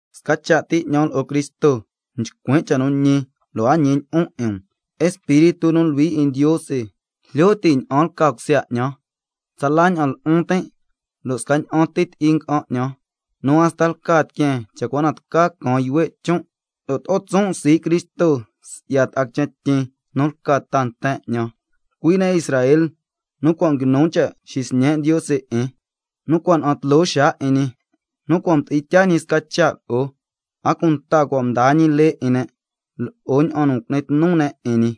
Sca cha' ti 'ñan lo'o Cristo nchcuin' cha' nu ñi lo' a ñilyi'on 'in um, Espíritu nu Luhui 'in Ndiose jlyo ti' ña'an lca cusya 'ñan. Tsala ña'an lu'un tin' lo' scaña'an ti ti'i nga'an 'ñan, nu hasta lca tiqueen cha' cua na tca caan yuhue' chon', lo' to'o tson' sii' Cristo si'ya ta'a quichen tyin nu lca ta nten 'ñan, cui' ne' Israel, nu cua' nguinu cha' xisñe' Ndiose 'in, nu cua' na'an tloo xaa 'in ñi, nu cua' mdi'in tyaa ñi sca cha' lo'o, a cunta cua' mdaa ñi lee 'in ne', lo'o ña'an nu cu'ni tnu ne' 'in ñi,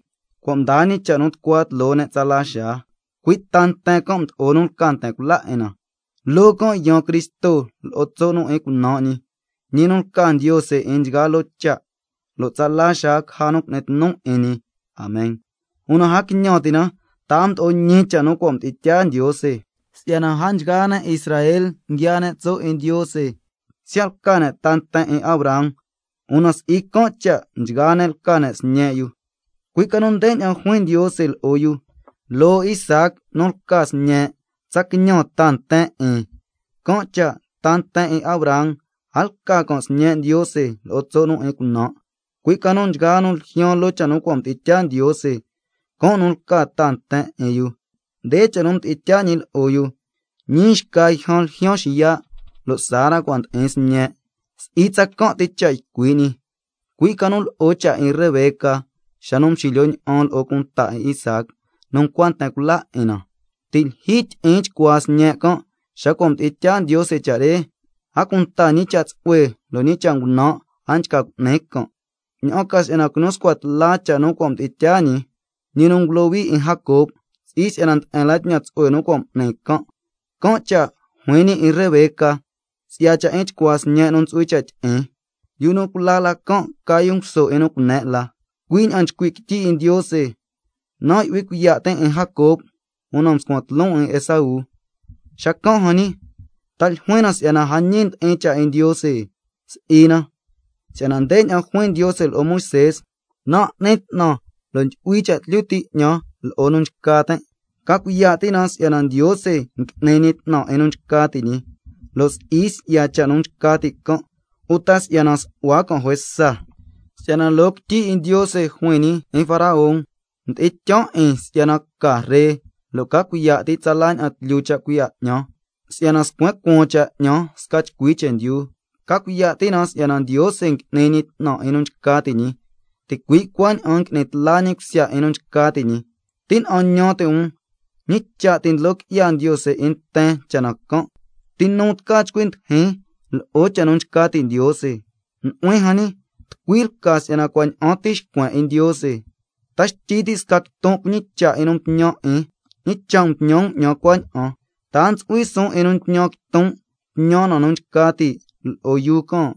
cua' mdaa ñi cha' nu tucua tloo ne' tsala xaa, cui' ta nten can' mdo'o nu lca nten cula 'in na, loo can' yaan Cristo lo'o tso' nu 'in cunan' ñi, ñi nu lca Ndiose 'in nchgaa loo cha', lo' tsala xaa caja nu cu'ni tnu 'in ñi. Amen. Una a quiñan ti' na ta si'yana a mdo'o ñi cha' nu cua' mdi'in tyaa Ndiose, si'yana a nchgaa ne' Israel nguiaa ne' tso' 'in Ndiose. Siya' lca ne' ta nten 'in Abraham, una si'i can' cha' nchgaa ne' lca ne' sñe' yu, cui' ca nu ndeña'an juin Ndiose lo'o yu: —Loo Isaac nu lca sñe' tsa quiñan ta nten 'in—. Can' cha' ta nten 'in Abraham a lca can' sñe' Ndiose lo'o tso' nu 'in cunan', cui' ca nu nchgaa nu ljyaan loo cha' nu mdi'in tyaa Ndiose, can' nu lca ta nten 'in yu. Nde cha' nu mdi'in tyaa ñi lo'o yu: —Ñii xca yjan ljyaan xiya', lo' Sara cua' ndi'in sñe'—. Si'i tsacan' ti cha' ycui' ñi, cui' ca nu lo'o cha' 'in Rebeca xa nu mxilyo ña'an lo'o cunta 'in Isaac nu ncua nten cula 'in na, (ti' lyijyi tyi'in chcuaa sñe' can' xa cua' mdi'in tyaa Ndiose cha' re, a cunta ñi cha' tsu'hue lo' ñi cha' ngunan' a nchca cu'ni can', ña'an ca si'yana quinu scua tla cha' nu cua' mdi'in tyaa ñi, ñi nu ngulohui 'in Jacob, lo' si'i si'yana nde'en la tñan tsu'hue nu cua' m'ni can'). Can' cha' juin ñi 'in Rebeca si'ya cha' 'in chcuaa sñe' nu ntsu'hui cha' tyi'in: —Yu nu cula la can' ca yu nguso 'in nu cune' la—. Cui' ña'an nchcui' quityi 'in Ndiose: —Nan' ndyu'hui cuiya' tin' 'in Jacob, una mscuan tloon 'in Esaú—. Xacan' jan ñi, ¿ta ljuin na si'yana a ñi ndi'in cha' 'in Ndiose? Si'i na. Si'yana ndeña'an juin Ndiose lo'o Moisé: —Nan' n'nin 'tnan lo' ndyu'hui cha' tlyu ti' 'ñan lo'o nu nchca tin'—. Ca cuiya' ti' na si'yana Ndiose n'ni ñi 'tnan 'in nu nchca ti' ñi, lo' si'i si'ya cha' nu nchca ti' can' uta si'yana nsu'hua can' juesa. Si'yana loo quityi 'in Ndiose juin ñi 'in Faraón: —Nan' mdi'in tyaan 'in si'yana ca ree, lo' ca cuiya' ti' tsala ña'an tlyu cha' cuiya' 'ñan, ña'an ca si'yana xcua cueen cha' 'ñan sca chcui chendyu—. Ca cuiya' ti' na si'yana Ndiose n'ni ñi 'tnan 'in nu nchca ti' ñi, ticui' cuaña'an n'ni tla ñi cusya 'in nu nchca ti' ñi. Tina'an ñan ti' um: ¿Ñi cha' ti' ndlo qui'ya Ndiose 'in nten cha' na can'? Si'yana, ¿ti nu tca chcui ndijin lo'o cha' nu nchca ti' Ndiose? Nu'huin jan ñi, ¿tucui lca si'yana cua' ña'an ti nxcuen 'in Ndiose? ¿—Ta xtyi ti' sca quiton' cuñicha' 'in nu mtñan 'in, ñi cha' mtñan 'ñan cuaña'an—? ¿Ta a ntsu'hui suun 'in nu ñan quiton', tñan na nu nchca ti' lo'o yuu can'?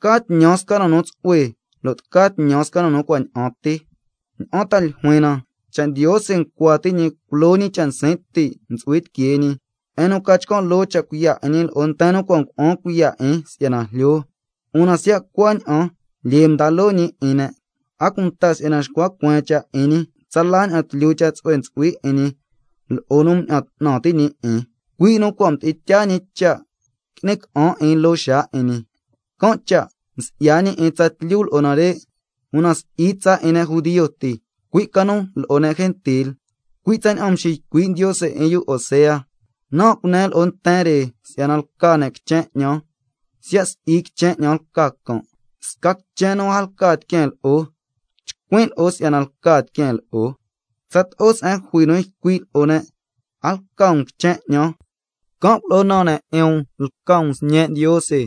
¿Tca tñan can' sca na nu tsu'hue lo' tca tñan can' sca na nu cua' ña'an ti. ¿Ña'an ta ljuin na? Cha' Ndiose ncua ti' ñi culo ñi cha' nsin' ti' ntsu'hui tiquee ñi, se'en nu ca chcan' loo cha' cuiya' 'in ñi lo'o nten nu cua' ngua'an cuiya' 'in si'yana jlyo, una siya' cuaña'an lyee mda loo ñi 'in ne', a cunta si'yana xcua cueen cha' 'in ñi, tsala ña'an tlyu cha' tsu'hue ntsu'hui 'in ñi lo'o nu mña'an 'tnan ti' ñi 'in, cui' nu cua' mdi'in tyaa ñi cha' qui'ni ca'an 'in loo xaa 'in ñi. Can' cha' msi'ya ñi 'in tsatlyu lo'o nare', una si'i tsa 'in ne' judio ti, cui' ca nu lo'o ne' gentil. Cui' tsaña'an mxiycui' Ndiose 'in yu Osea: —Nan' cunen lo'o nten re si'yana lca ne' quichen 'ñan, siya' si'i quichen 'ñan lca can'. Sca quichen nu a lca tiqueen lo'o, chcuin' lo'o si'yana lca tiqueen lo'o. Tsato'o se'en jui nu ycui' lo'o ne': A lca um quichen 'ñan, can' culo'o naan ne' 'in um lca um sñe' Ndiose,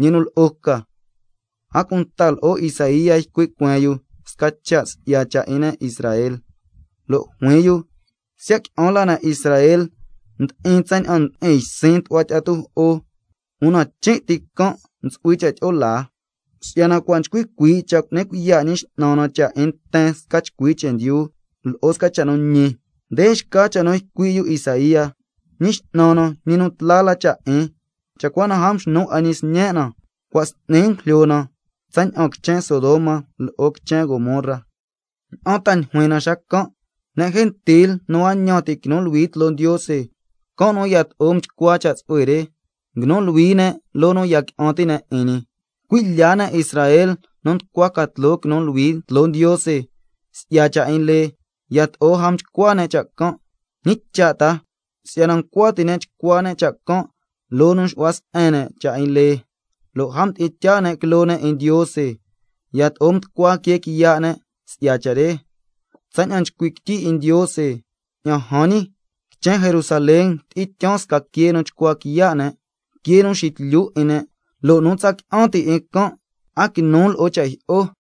ñi nu lo'o ca—. A cunta lo'o Isaía ycui' cueen yu sca cha' si'ya cha' 'in ne' Israel, lo' juin yu: —Siya' qui'an la ne' Israel ndi'in tsaña'an ndi'in ysin tu'hua tyi'a tujo'o, una chin' ti can' ntsu'hui cha' tyi'o laa, si'yana cua' nchcui cuii' cha' cu'ni cuiya' Ñi X'nan na cha' 'in nten sca chcui chendyu lo'o sca cha' nu ñi—. Nde xca cha' nu ycui' yu Isaía: —Ñi X'nan na, ñi nu tla la cha' 'in, cha' cua na a mxnu 'a ñi ta nten 'in na, cua' s'ni ngujlyo na tsaña'an quichen Sodoma lo'o quichen Gomorra—. ¿Ña'an ta ljuin na xacan'? Ne' gentil nu a ñan ti' quinu luhui tloo Ndiose, can' nu yato'o mchcua cha' tsu'hue re, nguinu luhui ne' loo nu ya qui'an ti' ne' 'in ñi. Cui' lya ne' Israel, nu nducua ca tloo quinu luhui tloo Ndiose si'ya cha' 'in lee, yato'o a mchcua ne' cha' can'. ¿Ñi cha' ta? Si'yana ncua ti' ne' chcua ne' cha' can' loo nu xu'hua se'en ne' cha' 'in lee, lo' a mdi'in tyaa ne' quiloo ne' 'in Ndiose, yato'o mducua quee quiya' ne' si'ya cha' re, tsaña'an nchcui' quityi 'in Ndiose: —Ña'an jan ñi, quichen Jerusalén tyi'in tyaan sca quee nu chcua quiya' ne', quee nu xitlyu 'in ne', lo' nu tsa qui'an ti' 'in can' a quinu lo'o cha' jyi'o—.